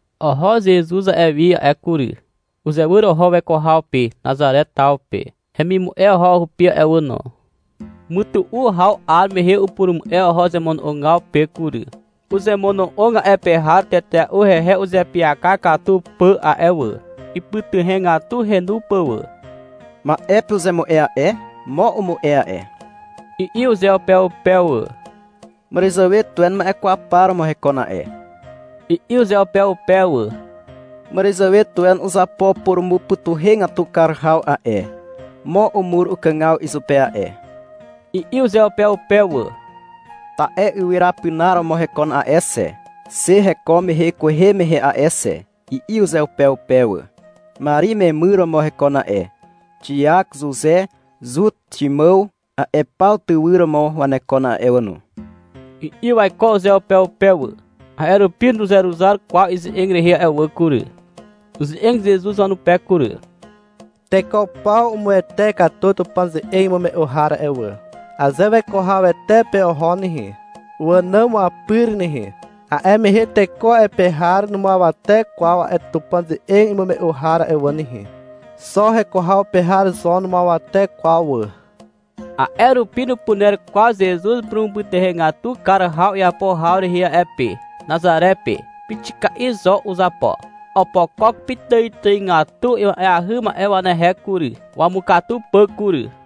Oho Zezuz a'e wi a'e kury. Uzewyr oho weko haw pe Nazare taw pe. Hemimu'e oho hupi a'e wà no. Mytu'u haw 'ar mehe upurumu'e oho zemono'ogaw pe kury. Uzemono'og a'e pe har tetea'u hehe uzeapyaka katu pà a'e wà. Ipytuhegatu henu pà wà. — Ma'e pe uzemu'e a'e. Mo umu'e a'e, i'i uzeupeupe wà. — Màràzàwe tuwe ma'e kwaw par romo hekon a'e, i'i uzeupeupe wà. — Màràzàwe tuwe uzapo purumupytuhegatu kar haw a'e, mo umur ukàgaw izupe a'e, i'i uzeupeupe wà. — Ta'e ywyra pinar romo hekon a'e xe, xe heko mehe kwehe mehe a'e xe, i'i uzeupeupe wà. — Mari memyr romo hekon a'e. Xiak, Zuze, Zut, Ximàw, a'e paw tywyr romo wanekon a'e wà no, i'i waiko uzeupeupe wà. A'e rupi nuzeruzar kwaw ize'eg rehe a'e wà kury. Uze'eg Zezuz wanupe kury. — Teko paw umuwete katu Tupàn ze'eg imume'u har a'e wà. Aze weko hawete pe oho nehe, wànàm wapyr nehe, a'e mehe teko a'e pe har numuawate kwaw a'e Tupàn ze'eg imume'u har a'e wà nehe. Xo heko haw pe har zo numuawate kwaw wà. A'e rupi nupuner kwaw Zezuz purumupytuhegatu kar haw iapo haw rehe a'e pe, Nazare pe. Pixika'i zo uzapo. Opokok pitàitàigatu ima'eahy ma'e wanehe kury, wamukatu pà kury.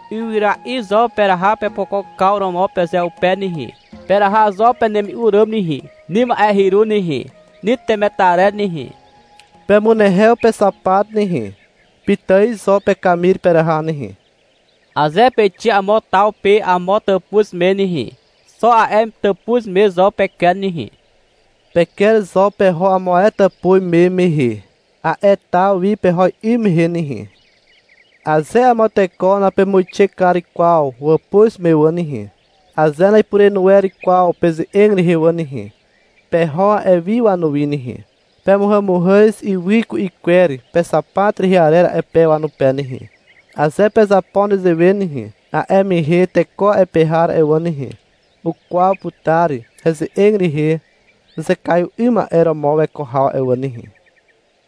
Ywyra'i zo peraha pepokokaw romo pezeupe nehe. Peraha zo penemi'u ràm nehe, ni ma'e hyru nehe, ni temetarer nehe. Pemunehew pexapat nehe. Pitài zo pekamir peraha nehe. Aze peixe amo taw pe amo tàpuz me nehe, xo a'e tàpuz me zo peker nehe. Peker zo peho amo ae tàpuz me mehe, a'e taw wi peho 'ym mehe nehe. Aze amo teko napemuixe kar kwaw wàpuz me wà nehe, aze na'ipurenu wer kwaw peze'eg rehe wà nehe, peho a'e wi wanuwi nehe. Pemuhàmuhàz ywy ku'i kwer pexapat rehe arer a'e pe wanupe nehe. Aze pezapo nezewe nehe, a'e mehe teko a'e pe har a'e wà nehe, ukwaw putar heze'eg rehe uzekaiw 'ym ma'e romo weko haw a'e wà nehe.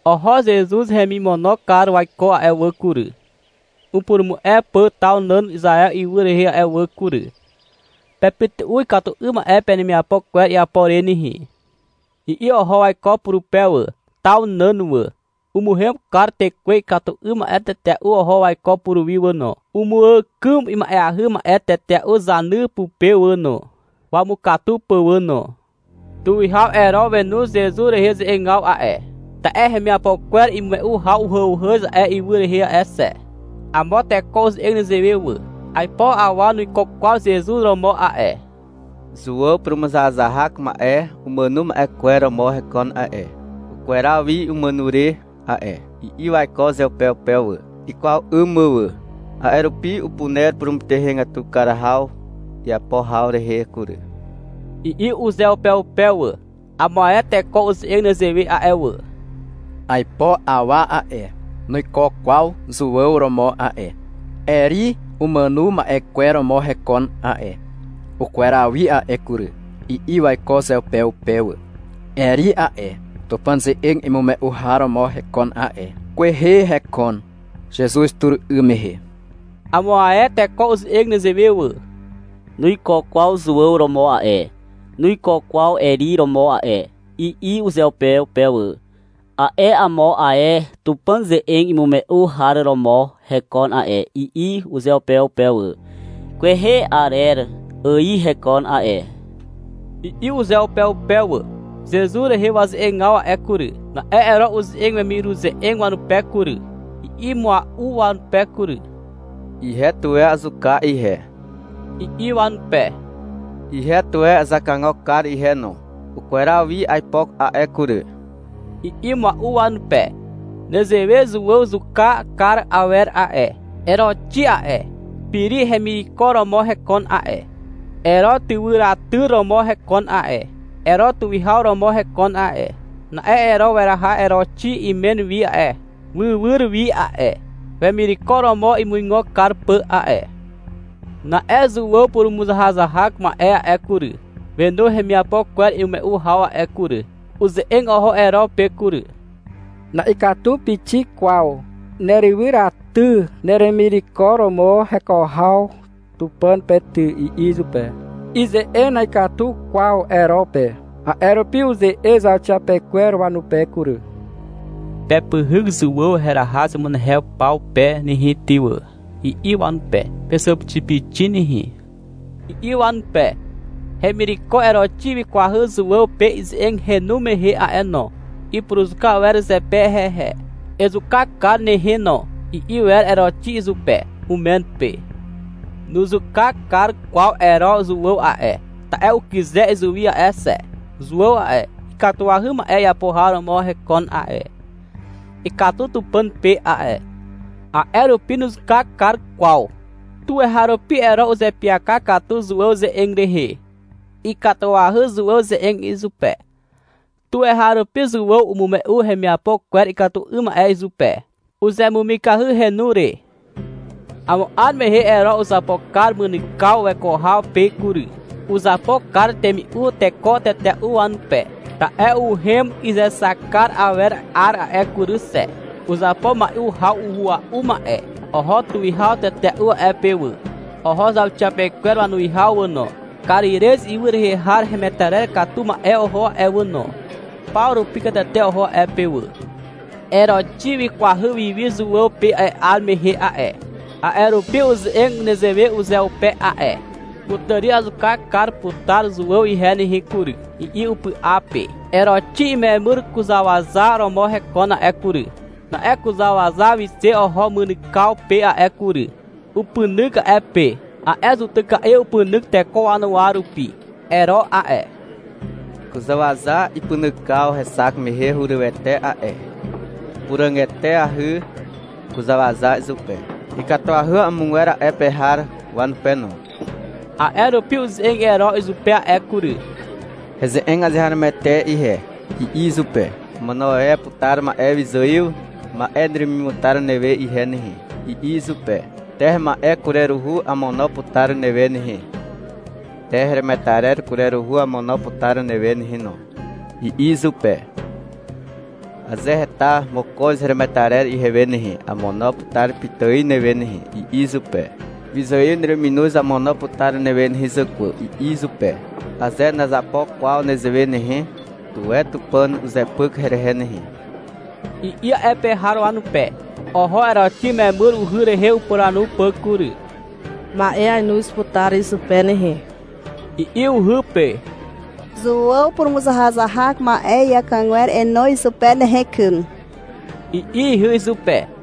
Oho Zezuz hemimono kar waiko a'e wà kury, upurumu'e pà taw nàn Izaew ywy rehe a'e wà kury. — Pepytu'u ikatu 'ym ma'e penemiapo kwer iapo re nehe, i'i oho waiko purupe wà, taw nàn wà. Umuhem kar tekwe ikatu 'ym ma'e tetea'u oho waiko puruwi wà no. Umuàkym ima'eahy ma'e tetea'u zany pupe wà no, wamukatu pà wà no. Tuwihaw Ero wenu Zezuz rehe ze'egaw a'e, ta'e hemiapo kwer imume'u haw uhàuhàz a'e ywy rehe a'e xe. Amo teko uze'eg nezewe wà. — Aipo awa nuiko kwaw Zezuz romo a'e. Zuàw purumuzahazahak ma'e umàno ma'e kwer romo hekon a'e. Ukweraw wi umàno re a'e, i'i waiko uzeupeupe wà, ikwaw 'ym mà wà. — A'e rupi upuner purumupytuhegatu kar haw iapo haw rehe kury, i'i uzeupeupe wà. Amo ae teko uze'eg nezewe a'e wà. — 'Aipo awa a'e, nuiko kwaw Zuàw romo a'e. Eri umàno ma'e kwer romo hekon a'e. Ukweraw wi a'e kury, i'i waiko uzeupeupe wà. Eri a'e, Tupàn ze'eg imume'u har romo hekon a'e. Kwehe hekon, Zezuz tur 'ym mehe. Amo ae teko uze'eg nezewe wà. — Nuiko kwaw Zuàw romo a'e, nuiko kwaw Eri romo a'e, i'i uzeupeupe wà. — A'e amo ae Tupàn ze'eg imume'u har romo hekon a'e, i'i uzeupeupe wà. — Kwehe arer ài hekon a'e, i'i uzeupeupe wà. Zezuz rehe waze'egaw a'e kury. Na'e Ero uze'eg wemiruze'eg wanupe kury. I'i mua'u wanupe kury. — Ihe tuwe azuka ihe, i'i wanupe. — Ihe tuwe azakagok kar ihe no. Ukweraw wi aipo a'e kury, i'i mua'u wanupe. Nezewe Zuàw zuka kar awer a'e. Eroxi a'e, Piri hemireko romo hekon a'e, Ero tywyraty romo hekon a'e. Ero tuwihaw romo hekon a'e. Na'e Ero weraha Eroxi imen wi a'e, wywyr wi a'e, wemireko romo imuigo kar pà a'e. Na'e Zuàw purumuzahazahak ma'e a'e kury, wenu hemiapo kwer imume'u haw a'e kury. Uze'eg oho Ero pe kury. — Na'ikatu pixik kwaw nerywyraty neremireko romo heko haw Tupàn pe ty, i'i izupe. Ize'eg na'ikatu kwaw Ero pe. A'e rupi uze'eg zauxiapekwer wanupe kury. — Pepyhyk Zuàw heraha zemunehew paw pe nehe ty wà, i'i wanupe. — Pezàpixipixi nehe, i'i wanupe. Hemireko Eroxi wikwahy Zuàw pe ize'eg henu mehe a'e no. Ipuruzuka wer zepe hehe. — Ezuka kar nehe no, i'i wer Eroxi izupe, umen pe. Nuzuka kar kwaw Ero Zuàw a'e, ta'e ukyze izuwi a'e xe. Zuàw a'e, ikatuahy ma'e iapo har romo hekon a'e, ikatu Tupàn pe a'e. A'e rupi nuzuka kar kwaw. Tuweharupi Ero uzeapyaka katu Zuàw ze'eg rehe. Ikatuahy Zuàw ze'eg izupe. Tuweharupi Zuàw umume'u hemiapo kwer ikatu 'ym ma'e izupe. Uzemumikahy henu re. Amo 'ar mehe Ero uzapo kar mynykaw weko haw pe kury. Uzapo kar temi'u teko tetea'u wanupe. Ta'e uhem izexak kar awer 'ar a'e kury xe. Uzapo mai'u haw uhua'u ma'e. Oho tuwihaw tetea'u a'e pe wà. Oho zauxiapekwer wanuwihaw wà no, Karirez ywy rehe har hemetarer katu ma'e oho a'e wà no. Paw rupi katete oho a'e pe wà. Eroxi wikwahy wiwi Zuàw pe a'e 'ar mehe a'e, a'e rupi uze'eg nezewe uzeupe a'e. — Kutàri azuka kar putar Zuàw ihe nehe kury, i'i upy'a pe. Eroxi imemyr kuzàwaza romo hekon a'e kury. Na'e kuzàwaza wixe oho mynykaw pe a'e kury. Upynyk a'e pe. (A'e zutyka'i upynyk teko wanuwa rupi.) Ero a'e, kuzàwaza ipynykaw hexak mehe hurywete a'e. Ipuràg eteahy kuzàwaza izupe, ikatuahy amogwer a'e pe har wanupe no. A'e rupi uze'eg Ero izupe a'e kury. — Heze'eg azeharomoete ihe, i'i izupe. — Amono e putar amo ma'e wyzài ma'e neremimutar newe ihe nehe, i'i izupe. — Te hema'e kureruhu amono putar newe nehe, te heremetarer kureruhu amono putar newe nehe no, i'i izupe. — Aze heta mokoz heremetarer ihewe nehe, amono putar pitài newe nehe, i'i izupe. — Wyzài nereminoz amono putar newe nehe zàkwà, i'i izupe. — Aze nazapo kwaw nezewe nehe, tuwe Tupàn uzepyk herehe nehe, i'i a'e pe har wanupe. Oho Eroxi memyr uhy rehe upuranu pà kury. — Ma'e ainoz putar izupe nehe, i'i uhy pe. — Zuàw purumuzahazahak ma'e iàkàgwer enoz izupe nehe kyn, i'i ihy izupe.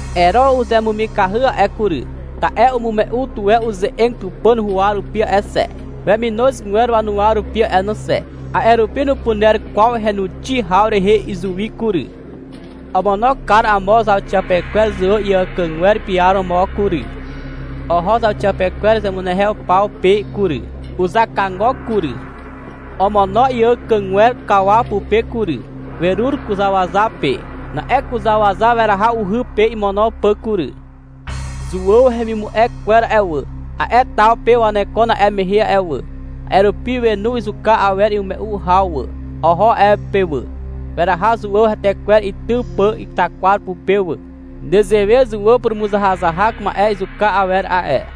Ero uzemumikahy a'e kury. Ta'e umume'u tuwe uze'eg Tupàn huwa rupi a'e xe, weminozgwer wanuwa rupi a'e no xe. A'e rupi nupuner kwaw henuxi haw rehe izuwi kury. Omono kar amo zauxiapekwer Zuàw iàkàgwer piaromo kury. Oho zauxiapekwer zemunehew paw pe kury, uzakagok kury. Omono iàkàgwer kawaw pupe kury. Werur kuzàwaza pe. Na'e kuzàwaza weraha uhy pe imono pà kury. Zuàw hemimu'e kwer a'e wà, a'e taw pe wanekon a'e mehe a'e wà. A'e rupi wenu izuka awer imume'u haw wà. Oho a'e pe wà. Weraha Zuàw hetekwer itym pà itakwar pupe wà. Nezewe Zuàw purumuzahazahak ma'e izuka awer a'e.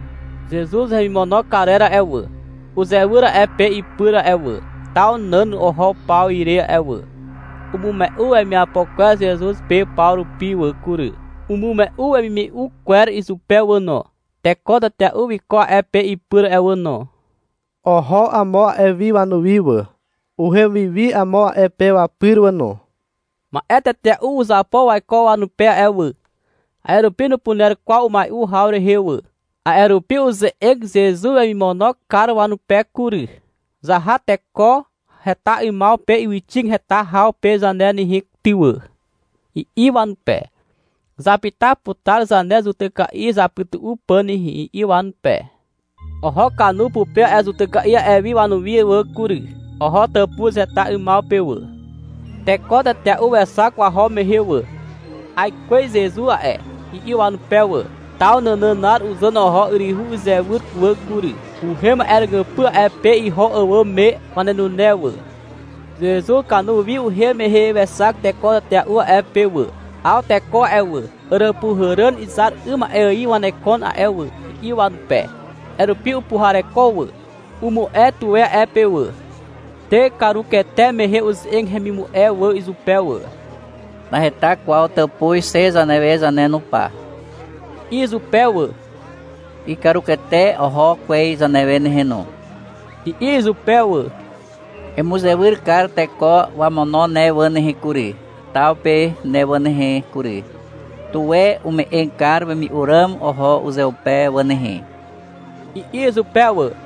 Zezuz hemimono karer a'e wà, uzewyr a'e pe ipyr a'e wà, taw nàn oho paw ire a'e wà. Umume'u wemiapo kwer Zezuz pe paw rupi wà kury, umume'u wemimume'u kwer izupe wà no. Teko tetea'u wiko a'e pe ipyr a'e wà no. Oho amo a'e wi wanuwi wà. Uhem wi wi amo a'e pe wapyr wà no. Ma'e tetea'u uzapo waiko wanupe a'e wà. A'e rupi nupuner kwaw umai'u haw rehe wà. A'e rupi uze'eg Zezuz wemimono kar wanupe kury. — Zaha teko heta 'ymaw pe ywyxig heta haw pe zane nehe ty wà, i'i wanupe. — Zapyta putar zane zutyka'i zapytu'u pà nehe, i'i wanupe. Oho kanu pupe a'e zutyka'i a'e wi wanuwi wà kury. Oho tàpuz heta 'ymaw pe wà. Teko tetea'u wexak waho mehe wà. — Aikwez Zezuz a'e, i'i wanupe wà. Taw nànànar uzàn oho yryhu izywyr wà kury. Uhem a'e ràgypy a'e pe iho àwàm me wanenune wà. Zezuz kanu wi uhem mehe wexak teko tetea'u a'e pe wà. — Aw teko a'e wà, àràpuhàràn izar 'ym ma'e ài wanekon a'e wà, i'i wanupe. A'e rupi upuhareko wà. Umu'e tuwe a'e pe wà. Te, karukete mehe uze'eg hemimu'e wà izupe wà. — Naheta kwaw tàpuz xe zanewe zane no pa, i'i izupe wà. — Ikarukete oho kwez zanewe nehe no, i'i izupe wà. Emuzewyr kar teko wamono ne wà nehe kury, taw pe ne wà nehe kury. Tuwe ume'eg kar wemi'u ràm oho uzeupe wà nehe, i'i izupe wà.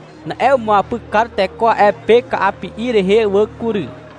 Na'e umuapyk kar teko a'e pe ka'api'i rehe wà kury.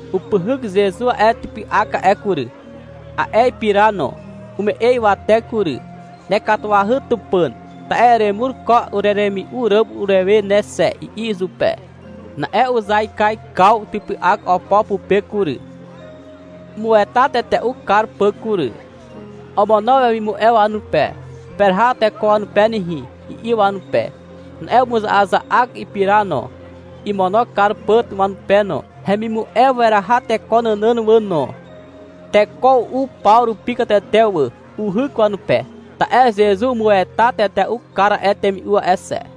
Upyhyk Zezuz a'e typy'ak a'e kury, a'e ipira no. Ume'e ywate kury. — Nekatuahy Tupàn, ta'e eremur ko ureremi'u ràm urewe ne xe, i'i izupe. Na'e uzaikaikaw typy'ak opo pupe kury, imueta tetea'u kar pà kury. Omono wemimu'e wanupe. — Peraha teko wanupe nehe, i'i wanupe. Na'e umuza'aza'ak ipira no, imono kar pà wanupe no. Hemimu'e weraha teko nànàn wà no. Teko u'u paw rupi katete wà. Uhyk wanupe, (ta'e Zezuz umueta tetea'u kar a'e temi'u a'e xe).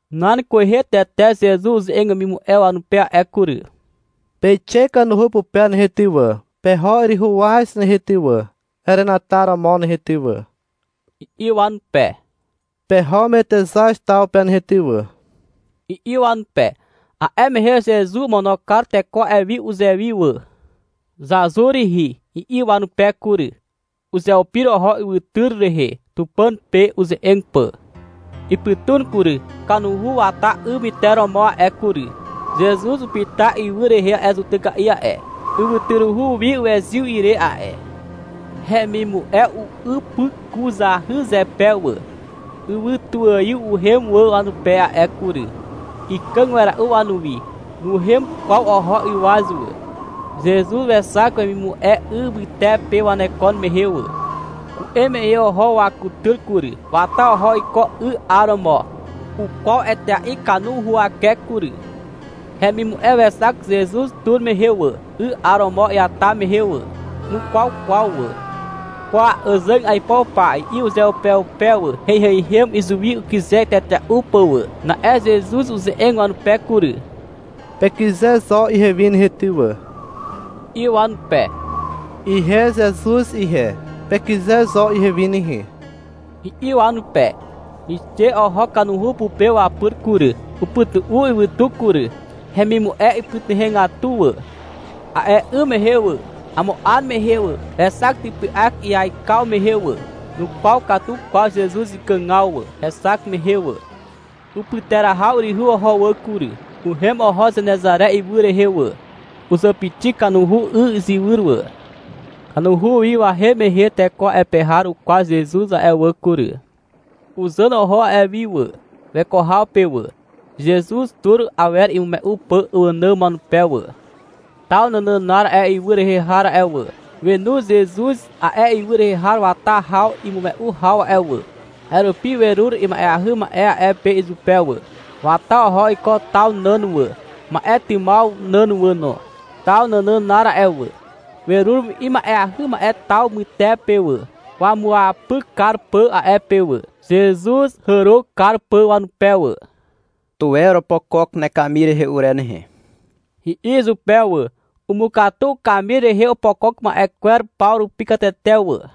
Nan kwehe tete Zezuz uze'eg wemimu'e wanupe a'e kury. — Peixe kanuhu pupe nehe ty wà, peho yryhu waz nehe ty wà, herenataromo nehe ty wà, i'i wanupe. — Peho Metexaz taw pe nehe ty wà, i'i wanupe. A'e mehe Zezuz omono kar teko a'e wi uzewi wà. — Zazur rihi, i'i wanupe kury. Uzeupir oho ywytyr rehe, Tupàn pe uze'eg pà. Ipytun kury. Kanuhu wata 'y myteromo a'e kury. Zezuz upyta ywy rehe a'e zutyka'i a'e, (ywytyruhu wi wezyw ire a'e). Hemimu'e u'ypykuzahy zepe wà. Ywytuaiw uhem wà wanupe a'e kury. Ikàg wera'u wanuwi. Nuhem kwaw oho ywaz wà. Zezuz wexak wemimu'e 'y mytepe waneko mehe wà. Ku'em mehe oho wakutyr kury. Wata oho iko 'y 'aromo. Ukwaw etea'i kanu huwake kury. Hemimu'e wexak Zezuz tur mehe wà, 'y 'aromo iata mehe wà. Nukwaw kwaw wà. — Kwa, àzàg aipo pa, i'i uzeupeupe wà. — Heiheihem izuwi ukyze tetea'u pà wà. Na'e Zezuz uze'eg wanupe kury. — Pekyze zo ihewi nehe ty wà, i'i wanupe. Ihe Zezuz ihe, pekyze zo ihewi nehe, i'i wanupe. Wixe oho kanuhu pupe wapyr kury. Upytu'u ywytu kury. Hemimu'e ipytuhegatu wà. A'e 'ym mehe wà, amo 'ar mehe wà, wexak typy'ak iaikaw mehe wà. Nukwaw katu kwaw Zezuz ikàgaw wà, hexak mehe wà. Upyterahaw yryhu oho wà kury. Uhem oho Zenezare ywy rehe wà. Uzàpixi kanuhu 'y izywyr wà. Kanuhu wi wahem mehe teko a'e pe har ukwaw Zezuz a'e wà kury. Uzàn oho a'e wi wà, weko haw pe wà, Zezuz tur awer imume'u pà wànàm wanupe wà. Taw nànànar a'e ywy rehe har a'e wà, wenu Zezuz a'e ywy rehe wata haw imume'u haw a'e wà. A'e rupi werur ima'eahy ma'e a'e pe izupe wà. Wata oho iko taw nàn wà, ma'e tymaw nàn wà no. Taw nànànar a'e wà, werur ima'eahy ma'e taw mytepe wà, wamuapyk kar pà a'e pe wà, Zezuz hàro kar pà wanupe wà. — Tuwe oropokok nekamir rehe ure nehe, i'i izupe wà. Umukatu ukamir rehe opokok ma'e kwer paw rupi katete wà.